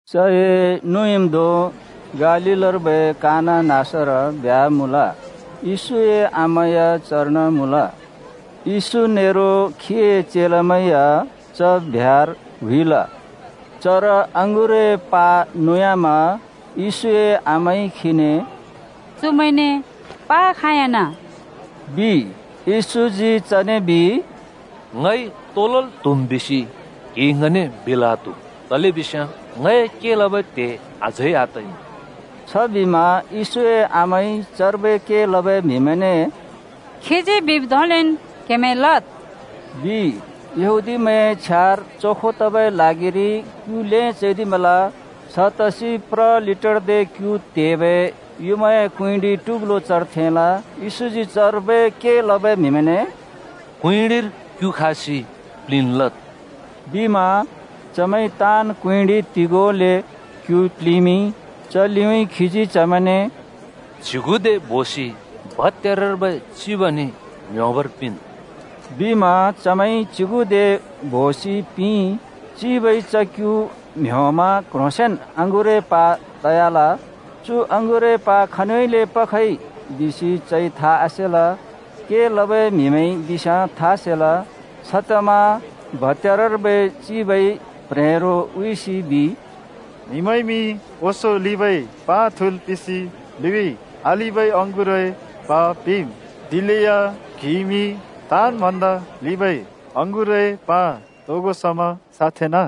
चए नुँइँम्‍धों गालीलर्बै काना नाँसर ब्ह्‍या मुँल। येशूए आमा या चर्न मुँल। येशू नेरो खीए चेलामैं या च ब्ह्‍यार हुइल। चर अँगुरए प्हा नुयामा येशूए आमाइ खीने “चुमैंने प्हा खाँयाँना,” बिइ। येशूजी चने बिइ, “ङइ तो लल् त्हुम् बिसि क्हिइ ङने बिल् आत्हु। तलेबिस्याँ ङए के लबै त्हे अझै आतइमुँ।” छबिमा येशूए आमाइ चर्बै के लबै म्हिमैंने “खीजी बिब् धोंलेन् क्हेमैंइ लद्,” बिइ। यहूदीमैंए छ्यार चोखो तबै ल्हागिरि क्यु ल्हें चैदिमल। छतसि प्र लिटरदे क्यु त्हेबै युँमाए कुँइँडि टुग्लो चर थेंल। येशूजी चर्बै के लबै म्हिमैंने “कुँइँडिर क्यु खासि प्लिंल् लद्,” बिमा। चमैंइ ताँन् कुँइँडि तिगोले क्यु प्लिंमिंइ। च लिउँइँ खीजी चमैंने “च्युगुदे बोसि भत्‍यारर्बै चिबने म्ह्‍योंबर पिंन्,” बिमा चमैंइ च्युगुदे बोसि पिंइ। चिबइ च क्‍यु म्‍ह्‍योंमा क्‍ह्रोंसेंन अँगुरए प्हा तयाल। चु अँगुरए प्हा खनिउँइँले पखए बिसि चइ था आसेल, के लबै म्हिमैंइ बिस्याँ था सेल। छतमा भत्‍यारर्बै चिबइ प्ह्रेंरो हुइसि बिइ। “म्हिमैंइमि ओंसों लिंबै प्हा थुँल् पिंसि लिउँइँ आलिंबै अँगुरए प्हा पिंम्, दिलेया क्‍हिइमि ताँन् भन्दा लिंबै अँगुरए प्हा तोगो समा साँथेंना!”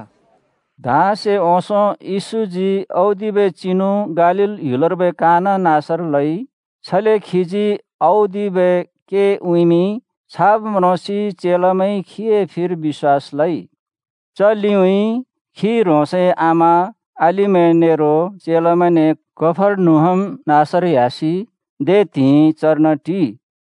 धाँसे ओंसों येशूजी औदिबै चिनु गालील ह्‍युलर्बै काना नाँसर लइ। छले खीजी औदिबै के उँइँमिंइ, छाब् म्रोंसि चेलामैंइ खीए फिर बिश्‍वास लइ। च लिउँइँ खी ह्रोंसए आमा, अलिमैं नेरो चेलामैंने कफर्नहुम नाँसर ह्‍यासि दे त्हिंइ चर्न टिइ।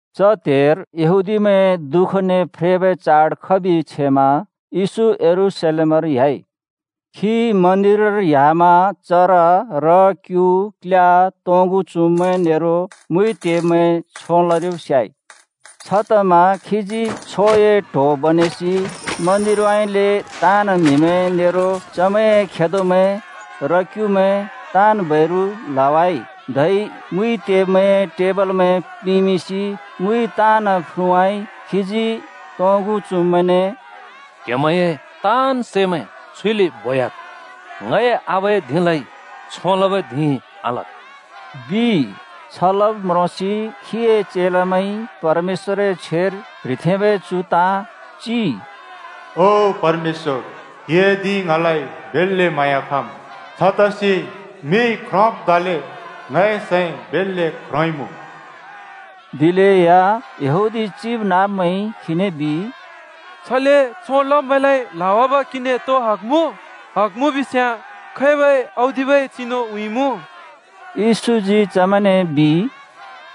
च त्‍हेर यहूदीमैंए दुःखने फ्रेबै चाड खबि छेमा येशू यरूशलेमर ह्‍याइ। खी मन्दिरर ह्‍यामा चर र-क्यु, क्ल्या, तोंगु चुँब्मैं नेरो मुइ त्हेब्मैंइ छों लरिब् स्याइ। छतमा खीजी छोए ट्‍हो बनेसि मन्दिरउँइँले ताँन् म्हिमैं नेरो चमैंए खेदोमैं, र-क्‍युमैं ताँन् बैरु ल्हवाइ, धै मुइ त्हेब्मैंए टेबलमैं प्लिंमिंसि मुइ ताँन् फ्रुँवाइ खीजी तोंगु चुँब्मैंने “क्हेमैंए ताँन् सैमैं छुइले बोह्‍याद्। ङए आबाए धिंलाइ छों लबै धिं आलद्,” बिइ। छ लब् म्रोंसि खीए चेलामैंइ परमेश्‍वरए छ्वेर प्‍ह्रिथेंबै चु ताँ चिइ, “ओ परमेश्‍वर, क्‍हिए धिं ङलाइ बेल्‍ले म्हाँया खम्। छतसि मिइ ख्रोंब् धोंले ङए सैं बेल्‍ले ख्रोंइँमुँ।” दिलेया यहूदी चिबनाँब्मैंइ खीने बिइ, “छले छों लब्मैंलाइ ल्हावाब क्हिने तो हग मुँ? हग मुँ बिस्याँ खैबै औदिबै चिनु उँइँमुँ?” येशूजी चमैंने बिइ,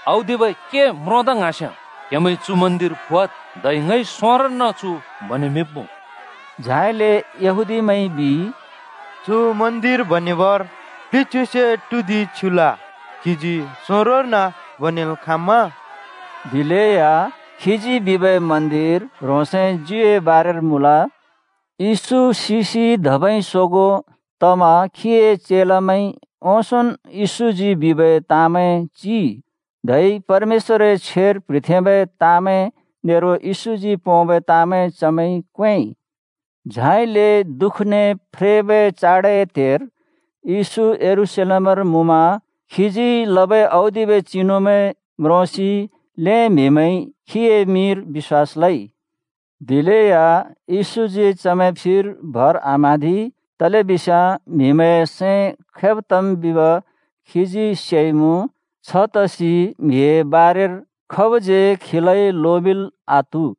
“औदिबै के म्रोंदा ङ्हाँस्‍याँ क्हेमैंइ चु मन्दिर फुवाद्, धै ङइ सोंरोर्न चु बनेमिंब्मुँ।” झाइले यहूदीमैंइ बिइ, “चु मन्दिर बनेबर प्लिच्युसे टुदिं छ्युल, क्‍हिजी सोंरोर्न बनेल् खाँम्मा?” दिलेया खीजी बिबै मन्दिर ह्रोंसए ज्युए बारेर मुँल। येशू सिसि धबै सोगों तमा खीए चेलामैंइ ओंसोंन् येशूजी बिबै ताँमैं चिइ, धै परमेश्‍वरए छ्वेर प्ह्रिथेंबै ताँमैं नेरो येशूजी पोंबै ताँमैं चमैंइ क्वेंइ। झाइले दुःखने फ्रेबै चाडए त्‍हेर येशू यरूशलेमर मुँमा। खीजी लबै औदिबै चिनुमैं म्रोंसि ल्‍हें म्हिमैंइ खीए मिंर बिश्‍वास लइ। दिलेया येशूजी चमैं फिर भर आम्हाँदि। तलेबिस्याँ म्हिमैंए सैं खैब तम् बिब खीजी सेइमुँ। छतसि म्हिए बारेर खाबज्यै खीलाइ लोमिंल् आत्हु।